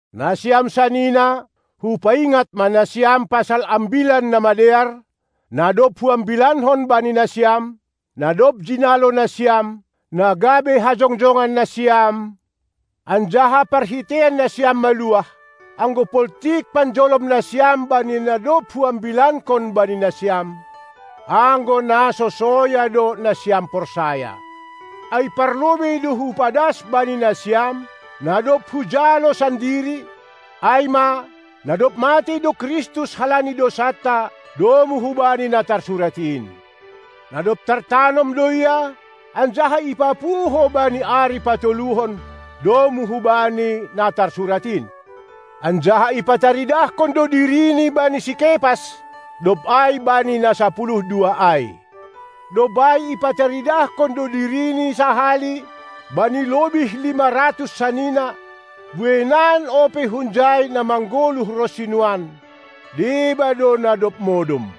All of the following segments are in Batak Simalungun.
Nasiam sanina, hupaingat ma nasiam pasal Ambilan Namadear, na dob huambilankon bani nasiam, na dob jinalo nasiam, na gabe hajongjongan nasiam, anjaha parhiteian nasiam maluah, anggo poltik panjolom nasiam bani na dob huambilankon bani nasiam; anggo na so soya do nasiam porsaya. Ai parlobei do hupadas bani nasiam, na dob hujalo sandiri, ai ma: Na dob matei do Kristus halani dousanta domu hubani na tarsurat in. Na dob tartanom do Ia, anjaha ipapuho bani ari patoluhon, domu hubani na tarsurat in. Anjaha ipataridahkon do diriNi bani si Kepas, dob ai bani na sapuluh dua ai. Dob ai ipataridahkon do diriNi sahali bani lobih lima ratus sanina; bueinan ope hunjai na manggoluh ronsi nuan, deba do na dob modom.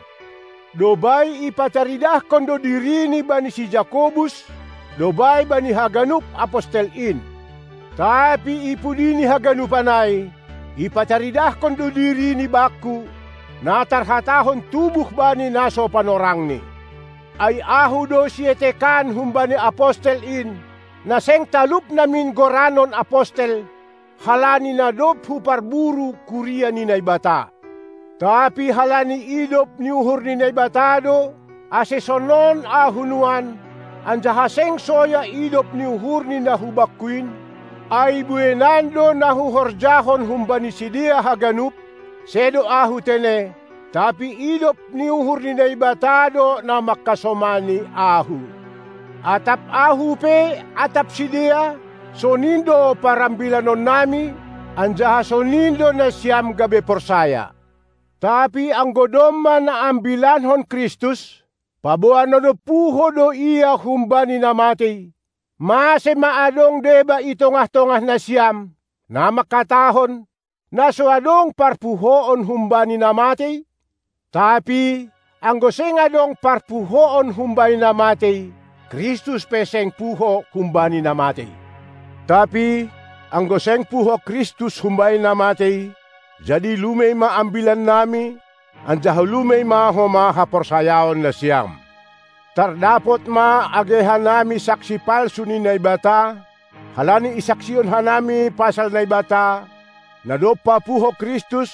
Dob ai ipataridahkon do diriNi bani si Jakobus, dob ai bani haganup apostel in. Tapi ipudi ni haganupan ai, ipataridahkon do diriNi bakku, na tarhatahon tubuh bani na so panorangni. Ai ahu do sietekan humbani apostel in, na seng talup namin goranon apostel, halani na dob huparburu kuria ni Naibata. Tapi halani idop ni uhur ni Naibata do, ase sonon ahu nuan, anjaha seng soya idop ni uhurNi na hubakku in, ai bueinan do na huhorjahon humbani sidea haganup; sedo ahu tene, tapi idop ni uhur ni Naibata do na mangkasomani ahu. Atap ahu pe atap sidea, sonin do parambilanonnami, anjaha sonin do nasiam gabe porsaya. Tapi anggo domma na ambilankon Kristus, paboa na dob puho do Ia humbani na matei, mase ma adong deba i tongah-tongah nasiam, na mangkatahon, na so adong parpuhoon humbani na matei? Tapi, anggo seng adong parpuhoon humbani na matei, Kristus pe seng puho humbani na matei. Tapi, anggo seng puho Kristus humbani na matei, jadi lumei ma ambilannami, anjaha lumei ma homa haporsayaon nasiam. Tardapot ma age hanami saksi palsu ni Naibata, halani isaksihon hanami pasal Naibata, na dob papuho Kristus,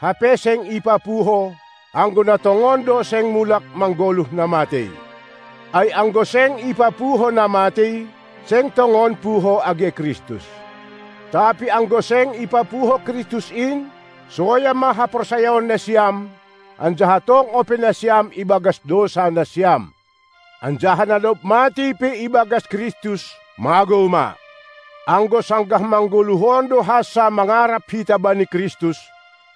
hape seng ipapuho, anggo na tongon do seng mulak manggoluh na matei. Ai, anggo seng ipapuho na matei, seng tongon puho age Kristus. Tapi, anggo seng ipapuho Kristus in, soya ma haporsayaon nasiam, anjaha tong ope nasiam ibagas dousa nasiam. Anjaha na dob matei pe ibagas Kristus magou ma. Anggo sanggah manggoluh on do hansa mangarap hita bani Kristus,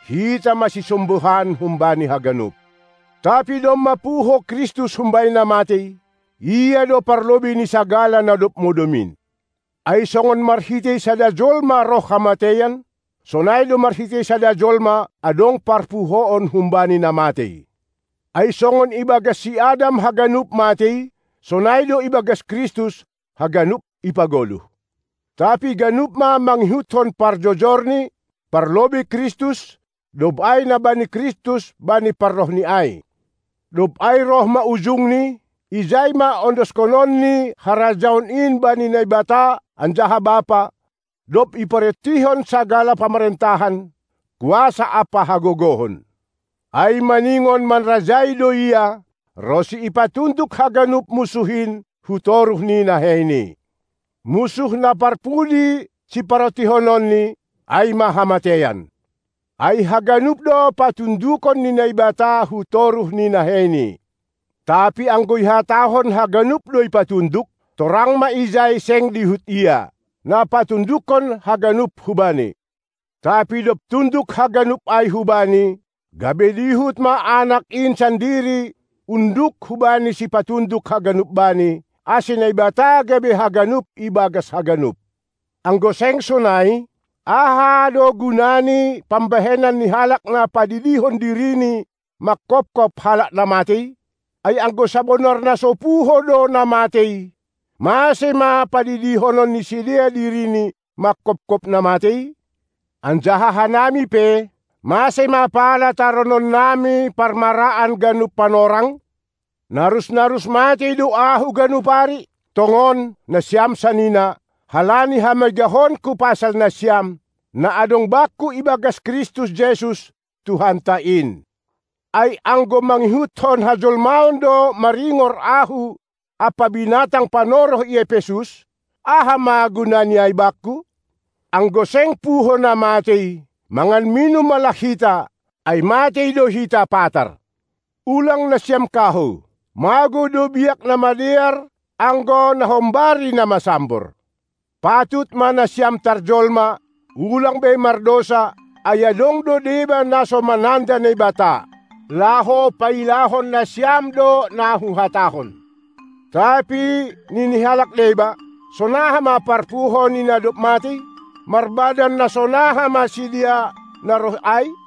hita ma sisombuhan humbani haganup. Tapi domma puho Kristus humbani na matei, Ia do parlobei ni sagala na dob modom in. Ai songon marhitei sada jolma roh hamateian, sonai do marhitei sada jolma adong parpuhoon humbani na matei. Ai songon ibagas si Adam haganup matei, sonai do ibagas Kristus haganup ipagoluh. Tapi ganup ma mangihutkon parjojorni; parlobei Kristus, dob ai na bani Kristus bani parrohNi ai. Dob ai roh ma ujungni; ijai ma ondoshononNi harajaon in bani Naibata anjaha Bapa, dob iparontihon sagala pamarentahan, kuasa ampa hagogohon. Ai maningon manrajai do Ia, ronsi ipatunduk haganup munsuh in hutoruh ni naheiNi. Munsuh na parpudi siparontihononNi, ai ma hamateian. Ai haganup do patundukon ni Naibata hutoruh ni naheiNi. Tapi anggo ihatahon haganup do ipatunduk, torang ma ijai seng dihut Ia, na patundukkon haganup hu-Bani. Tapi dob tunduk haganup ai hu-Bani, gabe dihut ma Anak in sandiri unduk hubani sipatunduk haganup Bani, ase Naibata gabe haganup ibagas haganup. Anggo seng sonai, aha do guna ni pambahenan ni halak na padidihon dirini mangkophop halak na matei? Ai anggo sabonar na so puho do na matei, mase ma padidihonon ni sidea dirini mangkophop na matei? Anjaha hanami pe, mase ma pala tarononnami parmaraan ganup panorang? Narus-narus matei do ahu ganup ari; tongon, nasiam sanina, halani hamegahonku pasal nasiam, na adong bakku ibagas Kristus Jesus, Tuhanta in. Ai anggo mangihutkon hajolmaon do maringor ahu ampa binatang panoroh i Epesus, aha ma gunani ai bakku? Anggo seng puho na matei, mangan minum ma lah hita, ai matei do hita patar. Ulang nasiam kahou! Magou do biak na madear, anggo nahombari na masambor. Patut ma nasiam tarjolma, ulang be mardousa, ai adong do deba na so mananda Naibata. Laho pailahon nasiam do na huhatahon. Tapi nini halak deba: Sonaha ma parpuho ni na dob matei? Marbadan na sonaha ma sidea na roh ai?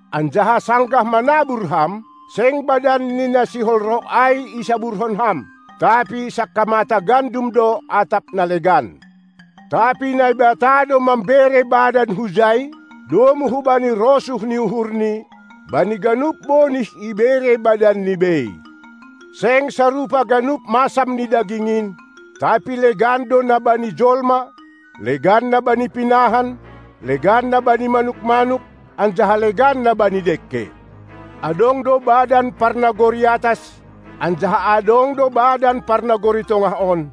Anjaha sanggah manabur ham, seng badan ni na sihol roh ai isaburhon ham, tapi sangkamata gandum do atap na legan. Tapi Naibata do mambere badan hujai, domu hubani rosuh ni uhurNi, bani ganup bonih ibere badanni bei. Seng sarupa ganup masam ni daging in, tapi legan do na bani jolma, legan na bani pinahan, legan na bani manuk-manuk, anjaha legan na bani dengke. Adong do badan parnagori atas anjaha adong do badan parnagori tongah on,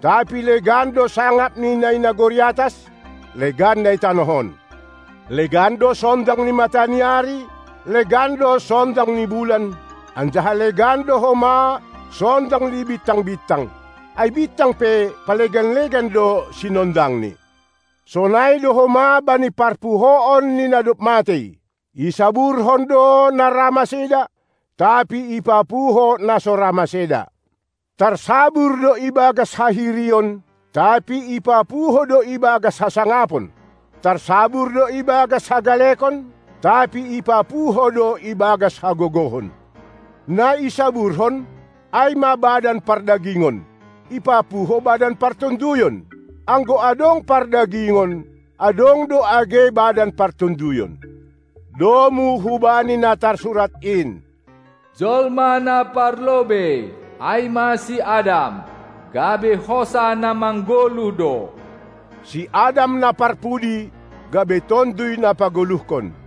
tapi legan do sangap ni na i nagori atas, legan na i tanoh on. Legan do sondang ni mata ni ari, legan do sondang ni bulan, anjaha legan do homa sondang ni bintang-bintang. Ai bintang pe palegan-legan do sinondangni. Sonai do homa bani parpuhoon ni na dob matei. Isaburhon do na ra maseda, tapi ipapuho na so ra maseda. Tarsabur do ibagas hahirion, tapi ipapuho do ibagas hasangapon. Tarsabur do ibagas hagalekon, tapi ipapuho do ibagas hagogohon. Na isaburhon, ai ma badan pardagingon, ipapuho badan partonduyon. Anggo adong pardagingon, adong do age badan partonduyon. Domu hubani na tarsurat in: Jolma na parlobei, ai ma si Adam, gabe hosah na manggoluh do. Si Adam na parpudi gabe Tonduy na pagoluhkon.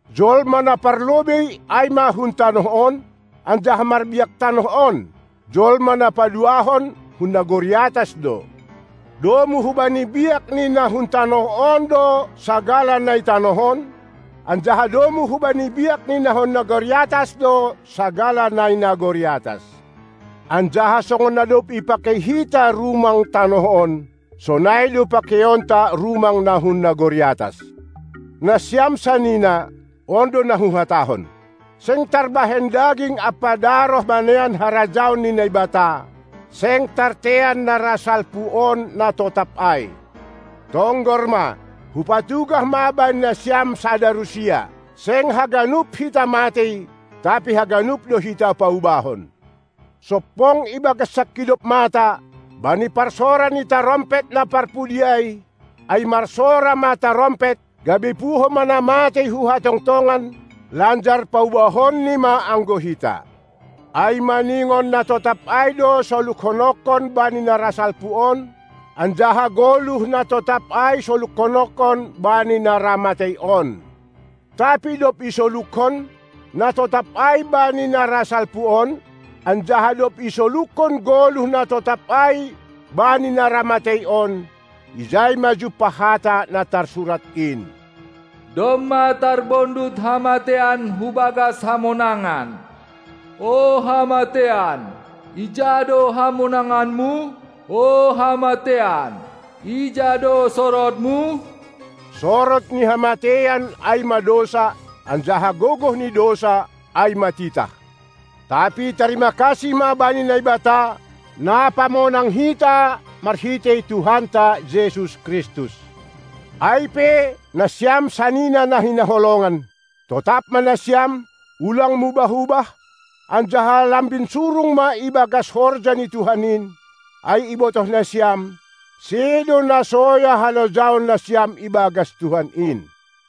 Jolma na parlobei ai ma hun tanoh on, anjaha marbiak tanoh on, jolma na paduahon hun nagori atas do. Domu hubani biak ni na hun tanoh on do sagala na i tanoh on; anjaha domu hubani biak ni na hun nagori atas do sagala na i nagori atas. Anjaha songon na dob ipakei hita rumang tanoh on, sonai do pakeionta rumang na hun nagori atas. Nasiam sanina, on do na huhatahon: Seng tarbahen daging ampa daroh manean harajaon ni Naibata, seng tartean na ra salpu on na totap ai. Tonggor ma, hupatugah ma bani nasiam sada rusia: Seng haganup hita matei, tapi haganup do hita paubahon. Sompong ibagas sangkidop mata, bani parsora ni tarompet na parpudi ai, ai marsora ma tarompet, gabe puho ma na matei hu hatongtongon, lanjar paubahonni ma anggo hita. Ai maningon na totap ai do solukhononkon bani na ra salpu on, anjaha goluh na totap ai solukhononkon bani na ra matei on. Tapi dob isolukhon, na totap ai bani na ra salpu on, anjaha dob isolukhon goluh na totap ai bani na ra matei on, ijai ma jumpah hata na tarsurat in: Domma tarbondut hamateian hubagas hamonangan. O hamateian, ija do hamonanganmu? O hamateian, ija do sorodmu? Sorod ni hamateian ai ma dousa, anjaha gogoh ni dousa ai ma titah. Tapi tarima kasih ma bani Naibata, na pamonang hita marhitei Tuhanta Jesus Kristus. Ai pe, nasiam sanina na hinaholongan, totap ma nasiam, ulang mubah-ubah, anjaha lambin surung ma ibagas horja ni Tuhan in, ai ibotoh nasiam, sedo na soya halojaon nasiam ibagas Tuhan in.